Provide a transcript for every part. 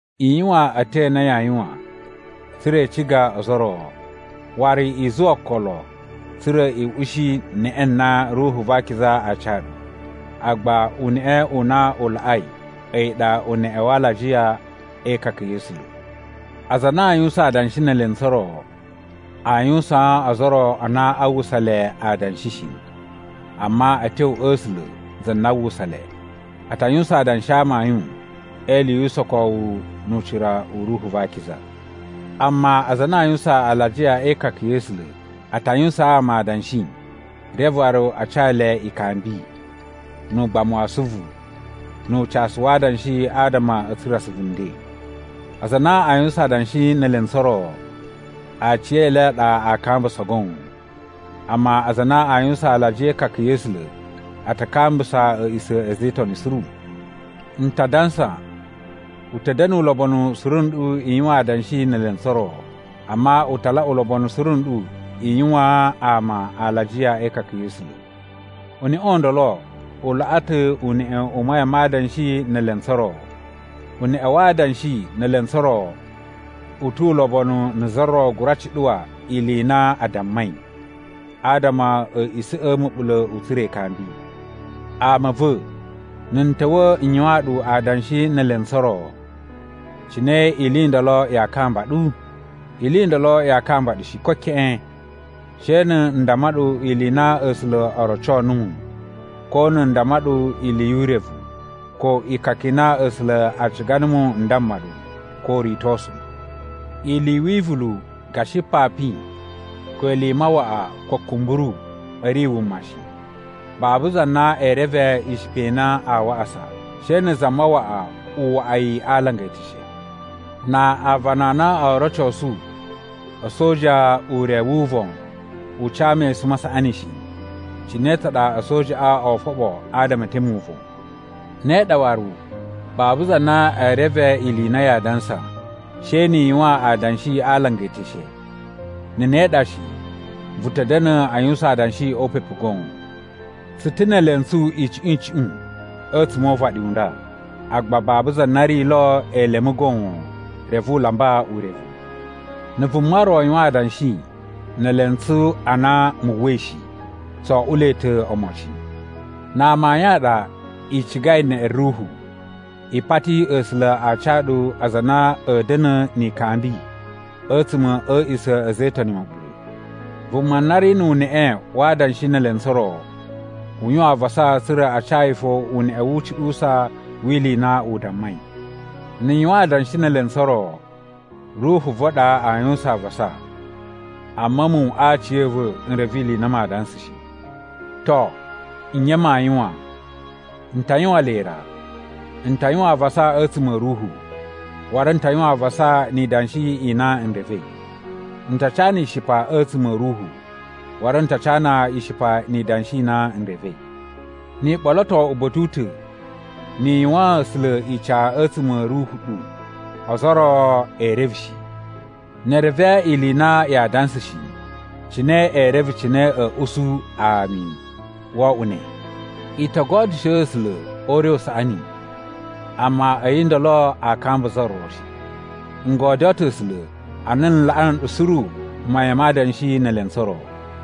I yuwan a̱tyo a na yaa yuwan tsa̱ra̱ i ciga ozo o ro. Waru i zuwa okolo tsa̱ra̱ i ushi neꞌe na Ruhu va Akiza aa ca ɗu. Agba uneꞌe u na u laꞌai a̱yi ɗa uneꞌe wa alajiya e ikaka ya̱ A̱sula̱. Aza a na aa yuwusan adanshi ne elentsu o ro, aa yuwusaan ozo o ro a na a uwwusa le adanshi shi, amma a̱ tyo a̱ A̱sula̱ za na a uwwusa le. A ta yuwusan adanshi a amayun e ili yu usokowu nu ucira u Ruhu va Akiza. Amma aza a na a yuwusan alajiya e ikaka ya̱ A̱sula̱ a ta yuwusaan ama adanshi reve waru a ca le ikambi, nu ugbamu wa asuvu, nu ucasu wa adanshi adama a̱ tsura̱ asuvu nden. Aza a na a yuwusan adanshi ne elentsu o ro, aciyele a ɗa aa kambusa goon, amma aza a na a yuwusan alajiya e ikaka ya̱ A̱sula̱ a ta kambusa a̱a̱ꞌisa̱ a̱ a̱za̱ e Itoni suru. N ta dansa, u ta̱ da̱na̱ ulobonu suru nɗu i yuwan adanshi ne elentsu o ro. Amma u ta laꞌa ulobonu suru nɗu i yuwaan ama alajiya e ikaka ya̱ A̱sula̱. Uneꞌe u ndolo u laꞌa ta̱ uneꞌe u mayan ma adanshi ne elentsu o ro. Uneꞌe wa adanshi ne elentsu o ro u tu ulobonu na̱ za ro gura cuɗuwa ili i na a dammai, adama a̱a̱ꞌisa̱ꞌa̱ ma̱ɓula̱ u tsura̱ ikambi. Ama a̱ va̱, na̱ n ta̱wa̱ n yuwaan ɗu adanshi ne elentsu o ro, cine ili i ndolo yaa kamba ɗu? Ili i ndolo yaa kamba ɗu shi, ko keꞌen, she na̱ n damma ɗu ili i na A̱sula̱ o roco numu, ko na̱ n damma ɗu ili yu urevu, ko ikaka i na A̱sula̱ a ciga numu n damma ɗu, ko uritosu. Ili i wivulu gashi papin ko ili mawaꞌa ko kumburu a̱ ri wuma shi. Babu za na ee reve ishipa i na aa waꞌasa, she na̱ za mawaꞌa u waꞌa yi a alanga eteshe. Na aavana a na oo rocosu a̱soja ure wu uvon u ca mesun ma saꞌani shi, cine tsa ɗa a̱sojaꞌa oo foɓo adama e teme uvon? Ne ɗa waru, babu za na ee reve ili i na yaa dansa, she ni i yuwan adanshi a alanga eteshe. Na̱ ne ɗa shi, vu ta̱ da̱na̱ a yuwusan adanshi o upepu goon. Tsu ta̱ ne elentsu icuꞌun icuꞌun a̱tsuma̱ o uvaɗi u nda, agba babu za na ri lo elemu goon reve u lamba urevu. Na̱ vuma ro yuwan adanshi ne elentsu a na mu uwwai shi, tso oꞌuloi ta̱ omocin. Na amayun a ɗa i cigai neꞌe Ruhu, i pati A̱sula̱ a ca ɗu aza a na a̱a̱ da̱na̱ ni ikambi a̱tsuma̱ a̱ a̱a̱ꞌisa̱ a̱ a̱za̱ e Itoni ma̱ɓula̱. Vuma na ri nu uneꞌe wa adanshi ne elentsu o ro, u yuwan avasa tsa̱ra̱ a ca yi fo uneꞌe wu ucuɗuwusa wi ili i na u dammai. Na̱ n yuwan adanshi ne elentsu o ro, ruhu va̱ ɗa aa yuwusan avasa, amma a̱mu aciya̱va̱ n reve ili i na maa dansa shi. To, nye maa yuwan? N ta yuwan le ra. N ta yuwan avasa a̱tsuma̱ a̱ ruhu, waru n ta yuwan avasa ni idanshi i na n revei. N ta cana ishipa a̱tsuma̱ a̱ ruhu, waru n ta cana ishipa ni idanshi i na n revei. Ni i ɓoloto uba̱ta̱ u ta̱, ni i yuwaan A̱sula̱ ica a̱tsuma̱ a̱ ruhu ɗu, ozo o ro ee reve shi. Ne e reve ili i na yaa dansa shi, cine ee reve cine a̱a̱ usu, “Ami, wo oꞌwo ne?” I to godyusho A̱sula̱ o ure u saꞌani, amma a̱yi ndolo aa kamba za ro shi. N godyoo ta̱ A̱sula̱ a na n laꞌa nɗu suru mayan ma adanshi ne elentsu o ro.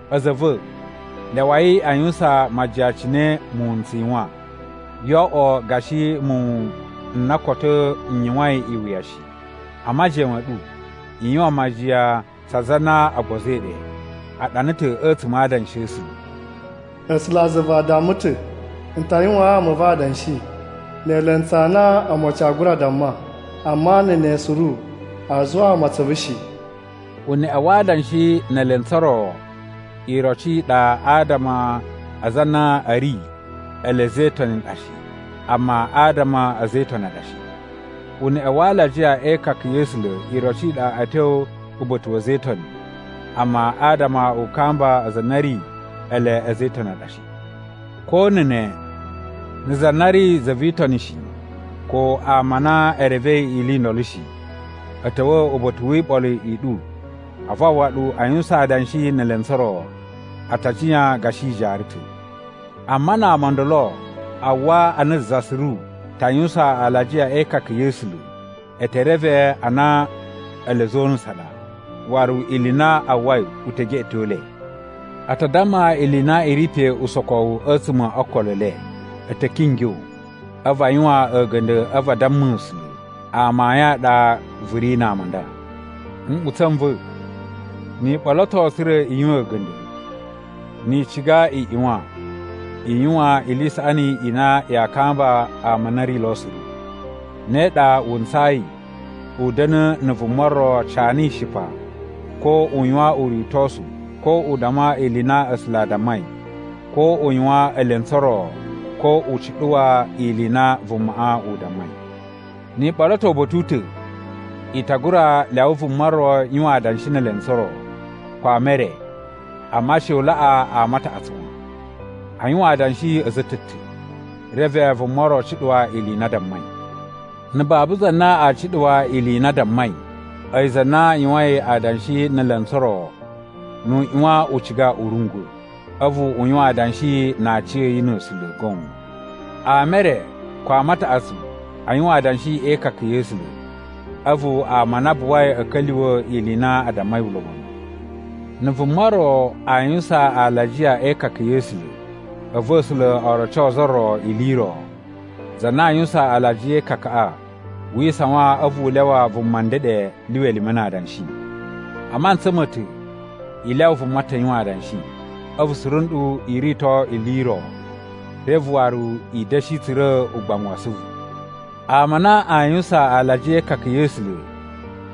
A̱za̱ a̱ va̱, lyawai a yuwusan majiyan cine muwun n tsu yuwan. Yoo oꞌwo gashi muwun n na koto n yuwain iwuya shi. A majiyan ma̱ ɗu i yuwan majiyan tsa aza a na o gbozoi ɗe. A ɗana ta̱ a̱tsuma̱ a Adanshi a̱ A̱sula̱: “A̱sulazuva a damma ta̱, ‘N ta yuwaan ama a̱ va̱ adanshi ne elentsu a na omocin aa gura damma. Amma na̱ ne suru aa zuwaa mu atsuvu shi.’” Uneꞌe wa adanshi ne elentsu o ro iroci i ɗa adama a aza a na a̱ ri ele a̱za̱ e Itoni a ɗa shi, amma adama a̱ a̱za̱ e Itoni a ɗa shi. Uneꞌe wa alajiya e ikaka ya̱ A̱sula̱ iroci i ɗa a̱ tyo uba̱ta̱ wa̱ a̱za̱ e Itoni, amma adama u kamba aza a na a̱ ri ele a̱za̱ e Itoni a ɗa shi. Ko na̱ ne, na̱ za na ri za vi Itoni shi ko ama a na e revei ili i ndolo shi, a̱ ta̱wa̱ uba̱ta̱ wi iɓolo i ɗu a̱vu a uwwa ɗu a yuwusan adanshi ne elentsu o ro, a ta jiyan gashi i jaara ta̱. Amma na ama o ndolo a uwwa a na za suru ta yuwusan alajiya e ikaka ya̱ A̱sula̱, e te reve a na ele a̱za̱ o unusu ɗa, waru ili i na a uwwai u te geꞌeto le. A ta damma ili i na i ri pe usokowu a̱tsuma̱ o okolo e le. A̱ ta̱ kingyo a̱vu a yuwan a̱ga̱nda̱ a̱vu a damma A̱sula̱, “Amayun a ɗa vu ri na ama a nda.” Nꞌutsa̱ n va̱, ni i ɓoloto tsa̱ra̱ i yuwan a̱ga̱nda̱, ni i ciga i ꞌyuwan i yuwan ili i saꞌani i na yaa kamba ama a na a̱ ri lo suru. Ne ɗa wu ntsayi u da̱na̱ na̱ vuma ro cana ishipa ko u yuwan uritosu ko u damma ili i na A̱sula̱ a dammai ko u yuwan elentsu o ro ko u cuɗuwa ili i na vumaꞌa u dammai. Ni i ɓoloto uba̱ta̱ u ta̱, i ta gura lyawa vuma ro yuwan adanshi ne elentsu o ro, ko ama e re, amma she u laꞌa ama a taꞌatsu wan. A yuwan adanshi a̱za̱ a̱ ta̱ ta̱, reve vuma ro cuɗuwa ili i na a dammai. Na̱ babu za na aa cuɗuwa ili i na a dammai, a̱yi za na yuwain adanshi ne elentsu o ro nu u ꞌyuwan u ciga u rungwa̱, a̱vu u yuwan adanshi na aciya̱yi na̱ A̱sula̱ goon. Ama e re ko ama a taꞌatsu a yuwan adanshi e ikaka ya̱ A̱sula̱, a̱vu ama a na a buwai a̱ ka̱lyuwa̱ ili i na a dammai ulobonu. Na̱ vuma ro aa yuwusan alajiya e ikaka ya̱ A̱sula̱, a̱vu A̱sula̱ o roco za ro ili i ro, za na a yuwusan alajiya e ikakaꞌa wi isawan a̱vu u lyawa vuma ndeɗe lyuwa elime na adanshi. A mantsa ma̱ ta̱ i lyawa vuma ta̱ yuwan adanshi, a̱vu suru nɗu i rito ili i ro, reve waru i da̱shi tsura̱ ugbamu wa asuvu. Ama a na a yuwusan alajiya e ikaka ya̱ A̱sula̱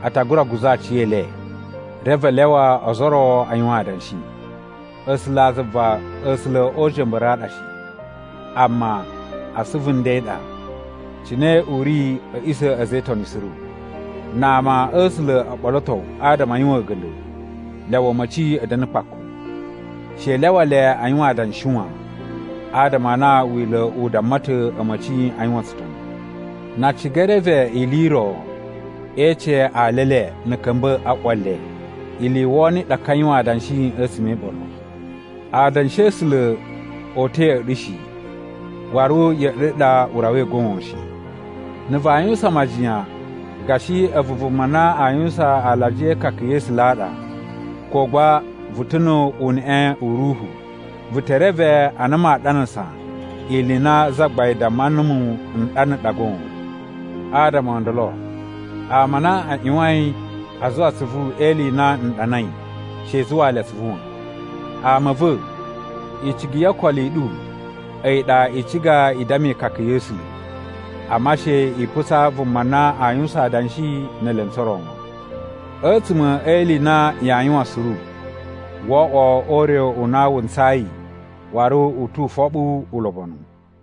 a ta gura guza̱ aciyele, reve a lyawa ozo o ro a yuwan adanshi. A̱sulazuva A̱sula̱ o uja̱mba̱ru a ɗa shi, amma a asuvu nden ɗa, cine u ri a̱ a̱ꞌisa̱ a̱ a̱za̱ e Itoni suru. Na ama a̱ A̱sula̱ o ɓoloto adama a yuwan a̱ga̱nda̱, lyawa a̱ma̱ci a̱ da̱na̱ kpaku. She i lyawa le a yuwan adanshi wan, adama a na Wila̱ u damma ta̱ a̱ma̱ci a yuwan tsutoni. Na a ciga e reve ili i ro, e ece ali e le na̱ a̱ ka̱mba̱ a ꞌwa le. Ili i wono i ɗa ka yuwan adanshi a̱tsuma̱ e iɓolo. Adanshi a̱ A̱sula̱ o uta̱ ya̱ꞌa̱ ɗu shi, waru ya̱ꞌa̱ ɗu ɗa u rawai goon shi. Na̱ vaa yuwusan majiyan gashi a̱vu vuma na a yuwusan alajiya e ikaka ya̱ A̱sula̱ a ɗa, ko gba vu ta̱ nu uneꞌe u ruhu, vu te reve a na maa ɗanasa ili i na Zagbain damma numu n ɗana ɗa goon. Adama o ndolo ama a na a ꞌyuwain a zuwa atsuvu e ili i na n ɗanai she i zuwaa le atsuvu wan. Ama a̱ va̱, icigi yo okolo i ɗu a̱yi ɗa i ciga i damma ikaka ya̱ A̱sula̱, amma she i putsa vuma na aa yuwusan adanshi ne elentsu o ro wan. A̱tsuma̱ e ili i na yaa yuwan suru wo oꞌwo o ure u na wu ntsayi waru u tu ufoɓu ulobonu.